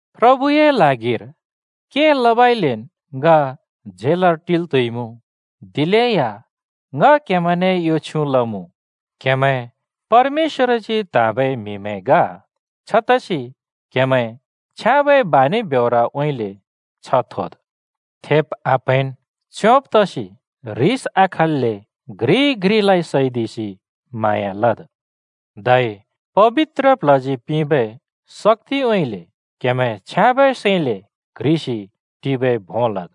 प्रभुए ल्हागिर के लबइलेन् ङ झेलर टिल् त्हुइमुँ, दिलेया ङ क्‍हेमैंने यो छ्युँ लमुँ: क्हेमैं परमेश्‍वरजी त्हाँबै म्हिमैं ग। छतसि क्हेमैं छ्याँबै बानि ब्योरउँइँले छ्ह थोद्। थेब् आप्‍हैंन्, च्योंब् तसि ह्रिस आखल्‍ले घ्रिइ घ्रिलाइ सैदिसि म्हाँया लद्। धै पबित्र प्ल्हजी पिंबै शक्‍तिउँइँले क्‍हेमैं छ्याँबै सैंले क्ह्रिसि टिबै भों लद्।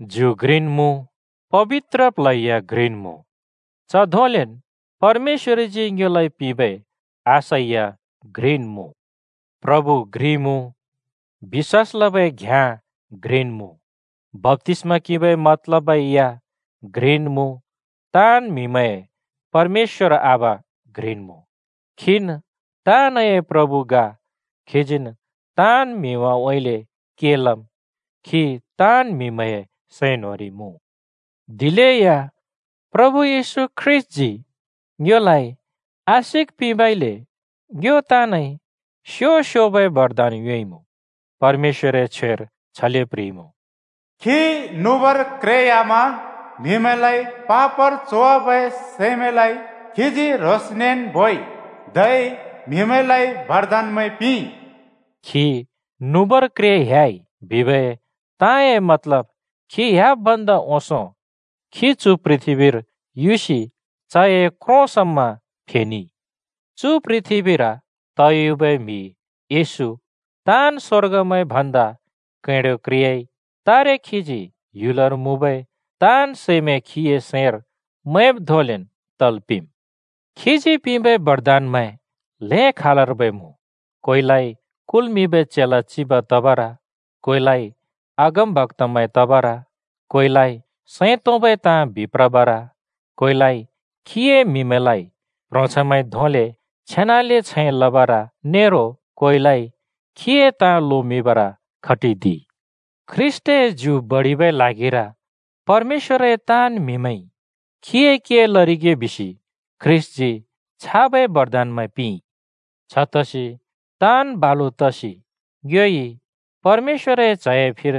ज्यु घ्रिन् मुँ, पबित्र प्ल्ह या घ्रिन् मुँ। च धोंलेन् परमेश्‍वरजी ङ्योलाइ पिंबै आशा या घ्रिन् मुँ। प्रभु घ्रि मुँ, बिश्‍वास लबै घ्‍याँ घ्रिन् मुँ, बप्‍तिस्‍मा किंबै मतलबै या घ्रिन् मुँ, ताँन् म्हिमैंए परमेश्‍वर आबा घ्रिन् मुँ। खीन् ताँनए प्रभु ग, खीजीन् ताँन् म्हिमैंउँइँले के लम्, खी ताँन् म्‍हिमैंए सैं न्‍होंरि मुँ। दिलेया प्रभु येशू ख्रीष्‍टजी ङ्योलाइ आशिक पिंबइले ङ्यो ताँनइ स्‍यो-स्‍योबै बरदान योंइमुँ। परमेश्‍वरए छ्वेर छले प्‍ह्रिइमुँ: “खी नुबर क्रे ह्‍यामा म्हिमैंलाइ पापर च्होवाबै सैमैंलाइ खीजी ह्रोंसनेन् बोइ, धै म्‍हिमैंलाइ बरदानमैं पिंइ।” खी “नुबर क्रे ह्‍याइ” बिबै ताँए मतलब खी ह्‍याब् भन्दा ओंसों खी चु पृथ्‍बीर युसि चए क्रों समा फेनेइ। चु पृथ्‍बीर तयुबै म्हि (येशू) ताँन् स्वर्गमैं भन्दा कैंडो क्रेयाइ। तारे खीजी ह्‍युलर मुँबै ताँन् सैमैं खीए सैंर मैंब् धोंलेन् तल् पिंम्। खीजी पिंबै बरदानमैं ल्‍हें खालर्बै मुँ। कोइलाइ कुल्मिंबै चेला चिब तबर, कोइलाइ अगमबक्‍तामैं तबर, कोइलाइ सैं तोंबै ताँ बिप्रबर, कोइलाइ खीए म्हिमैंलाइ प्‍ह्रोंछैंमैंइ धोंले छेनाले छैं लबर नेरो कोइलाइ खीए ताँ लोमिंबर खटिदिइ। ख्रीष्‍टए ज्यु बडिबै ल्हागिर परमेश्‍वरए ताँन् म्‍हिमैंइ खीए के लरिगे बिसि ख्रीष्‍टजी छाबै बरदानमैं पिंइ। छतसि ताँन् बालु तसि ङ्योइ परमेश्‍वरए च्‍हए फिर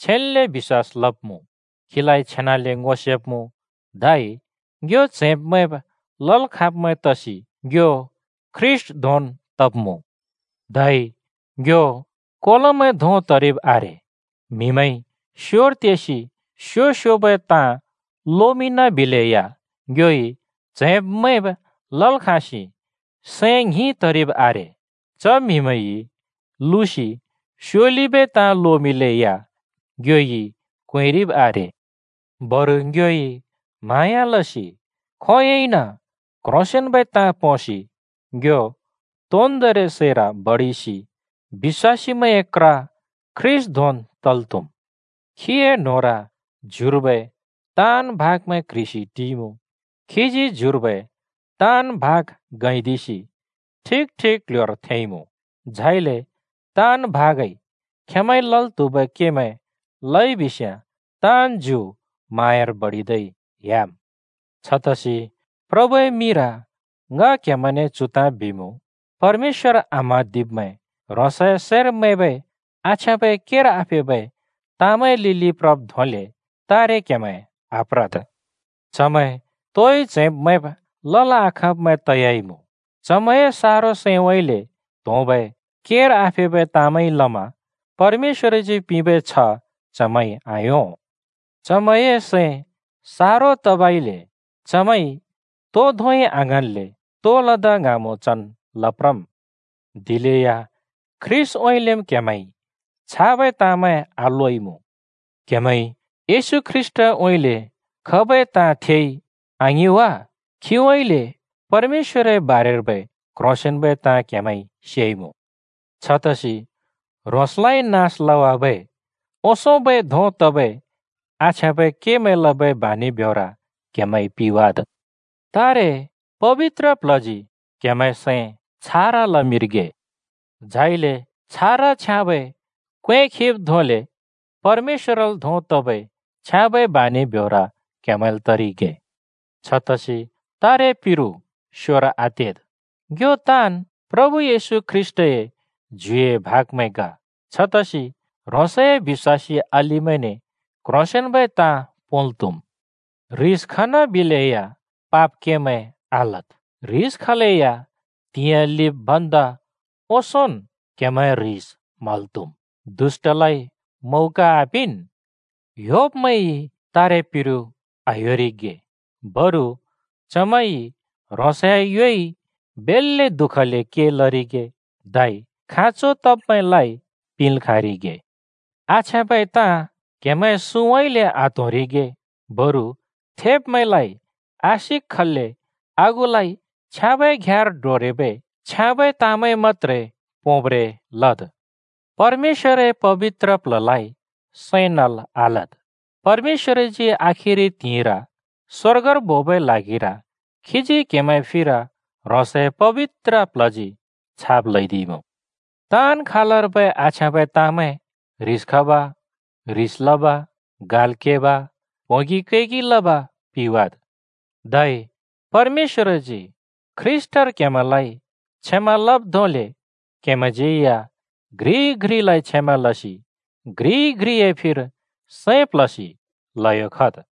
छेन्‍ले बिश्‍वास लब्‍मुँ, खीलाइ छेनाले ङो सेब्‍मुँ। धै ङ्यो च्हैंब् मैंब् लल् खाँब्मैं तसि ङ्यो ख्रीष्‍ट धोंन् तब्‍मुँ। धै ङ्यो कोलोमैं धों तरिब् आरे। म्हिमैंइ स्‍योर तेसि स्‍यो स्‍योबै ताँ लोमिंन बिलेया ङ्योइ च्हैब् मैंब् लल् खाँसि सैं ङ्हिं तरिब् आरे। च म्हिमैंइ लुसि स्योलिबै ताँ लोमिंलेया ङ्योइ क्‍वेंरिब् आरे। बरु ङ्योइ म्हाँया लसि खोंयोंइन क्‍ह्रोंसेंन्‍बै ताँ पोंसि ङ्यो तोन्दोंरि सैर बडिसि बिश्‍वासीमैंए क्र ख्रीष्‍ट धोंन् तल् त्‍हुम्। खीए न्होंर ज्युर्बै ताँन् भाग क्‍ह्रिसि टिइमुँ। खीजी ज्युर्बै ताँन् भाग गैंदिसि ठिक ठिक क्ल्ह्‍योर थेंइमुँ। झाइले ताँन् भागइ खेंमैंइ लल् त्हुबै केमैं लइ बिस्याँ ताँन् ज्यु म्हाँयार बडिदै ह्‍याम्। छतसि प्रभुए मिंर ङ क्हेमैंने चु ताँ बिमुँ, परमेश्‍वर आम्हाँदिब्मैं ह्रोंसए सैंर मैंबै आछ्याँबै केर आफेबै ताँमैंए लिलि प्रब् धोंले तारे क्‍हेमैं आप्रद्। चमैं तोइ च्हैंब-मैंब् लल् आखाँब्मैं तयाइमुँ। चमैंए सारो सैंउँइँले त्होंबै केर आफेबै ताँमैंइ लमा परमेश्‍वरजी पिंबै छ्ह चमैंइ आयों। चमैंए सैं सारो तबइले चमैंइ तो धोंइ आङ्हाँन्‍ले तो लदा ङ्हाँमुँ चन् लप्रम्। दिलेया ख्रीष्‍टउँइँलेम् क्‍हेमैंइ छाबै ताँमैं आलोइमुँ। क्हेमैंइ येशू ख्रीष्‍टउँइँले खबै ताँ थेइ, आङिं वा? खीउँइँले परमेश्‍वरए बारेर्बै क्‍ह्रोंसेंन्‍बै ताँ क्हेमैंइ सेइमुँ। छतसि ह्रोंसलाइ नास लवाबै ओंसोंबै धों तबै आछ्याँबै केमैं लबै बानि ब्योर क्हेमैंइ पिवाद! तारे पबित्र प्ल्हजी क्हेमैंए सैं छारा लमिंरिगे। झाइले छारा छ्याँबै क्‍वें खिब् धोंले परमेश्‍वरल् धों तबै छ्याँबै बानि ब्योर क्हेमैंल् तरिगे। छतसि तारे पिरु स्‍योर आतेद्। ङ्यो ताँन् प्रभु येशू ख्रीष्‍टए ज्युए भागमैं ग। छतसि ह्रोंसए बिश्‍वासी अलिमैने क्ह्रोंसेंन्बै ताँ पोंल् त्‍हुम्। ह्रिस खनाबिलेया पाप केमैं आलद्। ह्रिस खलेया त्हिंयाँ लिब् भन्दा ओंसोंन् क्हेमैंए ह्रिस म्हल् त्हुम्। दुष्‍टलाइ मौका आपिंन्। ह्‍योब्मैंइ तारेपिरु आह्‍योरिगे, बरु चमैंइ ह्रोंसए योइ बेल्‍ले दुःखले के लरिगे धै खाँचो तब्मैंलाइ पिंल् खाँरिगे। आछ्याँबै ताँ क्‍हेमैंए सुँउँइँले आत्‍होंरिगे, बरु थेब्मैंलाइ आशिक खल्‍ले आगुलाइ छ्याँबै घ्याँर डोरेबै छ्याँबै ताँमैं मत्‍त्रे पोंब्रें लद्। परमेश्‍वरए पबित्र प्ल्हलाइ सैं नल् आलद्। परमेश्‍वरजी आखिरि त्हिंइर स्‍वर्गर बोबै ल्हागिर खीजी क्हेमैंए फिर ह्रोंसए पबित्र प्ल्हजी छाप ल्हैदिइमुँ। ताँन् खालर्बै आछ्याँबै ताँमैं, ह्रिस खब, ह्रिस लब, गाल् केब, प्होंगि कैगि लब पिवाद्। धै परमेश्‍वरजी ख्रीष्‍टर क्हेमैंलाइ क्षमा लब् धोंले क्हेमैंज्यै या घ्रिइ घ्रिलाइ क्षमा लसि घ्रिइ घ्रिए फिर सैं प्ल्हसि ल्हयो खद्।